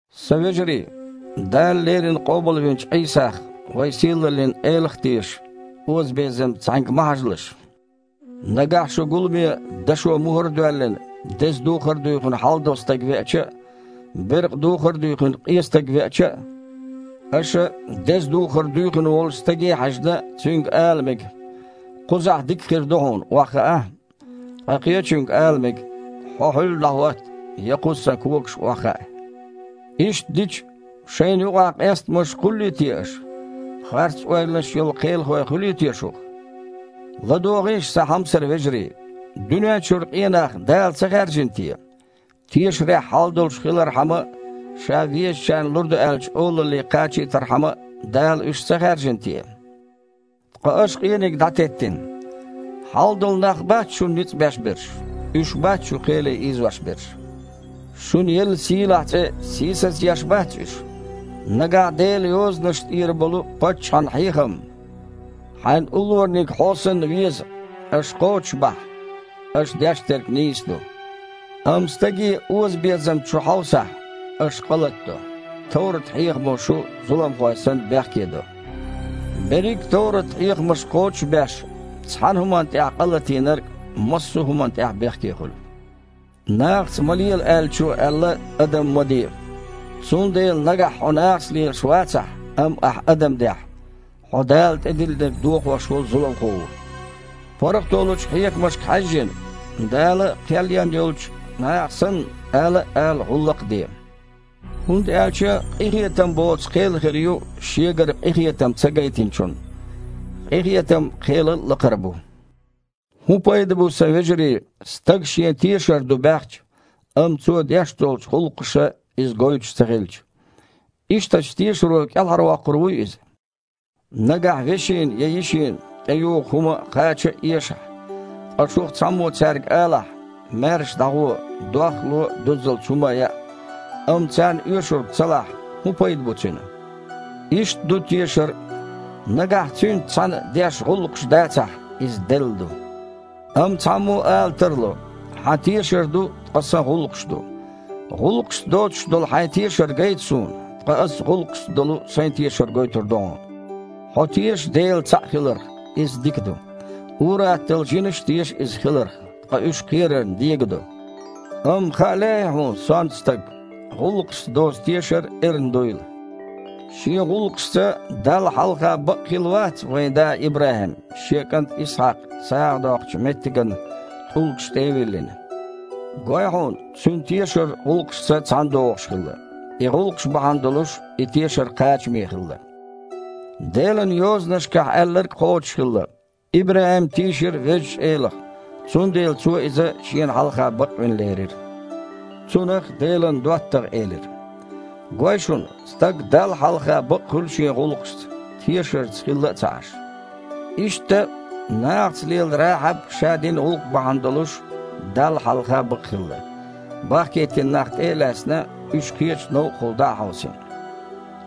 Сан вежарий! Дала леррина къобалвинчу Іийсах, вайн сийлаллин Элах, а тешаш, озабезамца цхьаьнга ма хьажалаш. Нагахь шун гуламе, дашо мухІар а доьллина, деза духар дуьйхина хьалдолу стаг веача а, беркъа духар дуьйхина къен стаг веача а, аша, деза духар дуьйхина волчу стаге а хьаьжна, цуьнга ала мега: «Кхузахь дика хир ду хьуна, охьахаа», ткъа къечуьнга ала мега: «Хьо хьуьлла дІахІотта, я кхуза, сан когашка, охьахаа». Иштта дича, шайна юкъахь къестамаш кхуллий те аша? Харц-ойланаш йолу кхелахой хуьлий те шух? ЛадогІийша, сан хьомсара вежарий, дуьнен чуьра къен нах Дала ца хаьржина те? Тешарехь хьал долуш хилархьама а, Ша везачарна лур ду аьллачу олалле кхачийтархьама а Дала уьш ца хаьржина те? Ткъа аша къениг дІатеттина. Хьалдолу нах бац шуна ницкъ беш берш, уьш бац шу кхеле ийзош берш? Шуна елла сийлахь цІе сийсазъеш бац уьш? Нагахь Делан Йозанашна тІера болу паччахьан хьехам: «Хьайн уллораниг хьо санна веза», аша кхочушбахь, аша деш дерг нийса ду. Амма стаге озабезамца шу хьовсахь, аша къа латадо, товрат-хьехамо шу, зуламхой санна, бехкедо. Берриг а товрат-хьехамаш кхочуш а беш, цхьана хІуманна тІехь къалатийнарг массо а хІуманна тІехь а бехке хуьлу. «Нахаца ма лела», – Аьллачо аьлла: «Адам ма де», цундела, нагахь хьо нахаца лелаш вацахь, амма ахь адам дехь, хьо Дала тІедиллинарг дохош волу зуламхо ву. ПаргІато лучу хьехамашка хьаьжжина, Дала кхел ен йолчу наха санна, ала а ала, гІуллакх а де. ХІунда аьлча къинхетам боцу кхел хир ю шегара къинхетам ца гайтинчунна. Къинхетам кхелал а лакхара бу. ХІун пайда бу, сан вежарий, стага шен тешар ду баьхча, амма цо деш долчу гІуллакхаша иза гойтуш ца хилча? Ишттачу тешаро кІелхьарвоккхур вуй иза? Нагахь вешина я йишина тІеюху хІума а, кхача а эшахь, ткъа шух цхьаммо цаьрга алахь: «Маьрша дІагІо, дох а ло, дуззалц хІума а яа», амма царна оьшург ца лахь, хІун пайда бу цуьнан? Иштта ду тешар а, нагахь цуьнца цхьаьна деш гІуллакхаш дацахь, иза делла ду. Амма цхьаммо ала тарло: «Хьан тешар ду, ткъа сан гІуллакхаш ду». ГІуллакхашца доцуш долу хьайн тешар гайта суна, ткъа аса гІуллакхашца долу сайн тешар гойтур ду хьуна. Хьо теша Дела цхьаъ хиларх, иза дика ду. Ур-атталла жинаш а теша Иза хиларх – ткъа уьш кхерарна дегадо! Амма хаа лаьий хьуна, сонта стаг, гІуллакхашца доцу тешар эрна дуйла? Шен гІуллакхашца Далла хьалха бакъхилла вац вайн да ИбрахІим, шен кІант Исхьакх сагІа доккхучу меттиган тІулгашна тІе а виллина? Гой хьуна, цуьнан тешар гІуллакхашца цхьаьнадогІуш хилла, и гІуллакхаш бахьана долуш и тешар кхачаме хилла. Делан Йозанашкахь аьлларг кхочушхилла: «ИбрахІим тийшира Везачу Элах, цундела Цо иза Шена хьалха бакъвина лерира», цунах Делан доттагІа элира. Гой шуна, стаг Далла хьалха бакъхуьлу шен гІуллакхашца, тешарца хилла а ца Іаш. Иштта, нахаца лела Рахьаб ша дина гІуллакх бахьана долуш Далла хьалха бакъхилла, бахкийтина нах тІе а лаьцна, уьш кхечу новкъахула дІа а хьовсийна.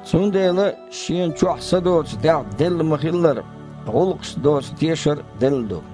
Цундела, шена чохь са доцу дегІ делла ма-хиллара, гІуллакхашца доцу тешар а делла ду.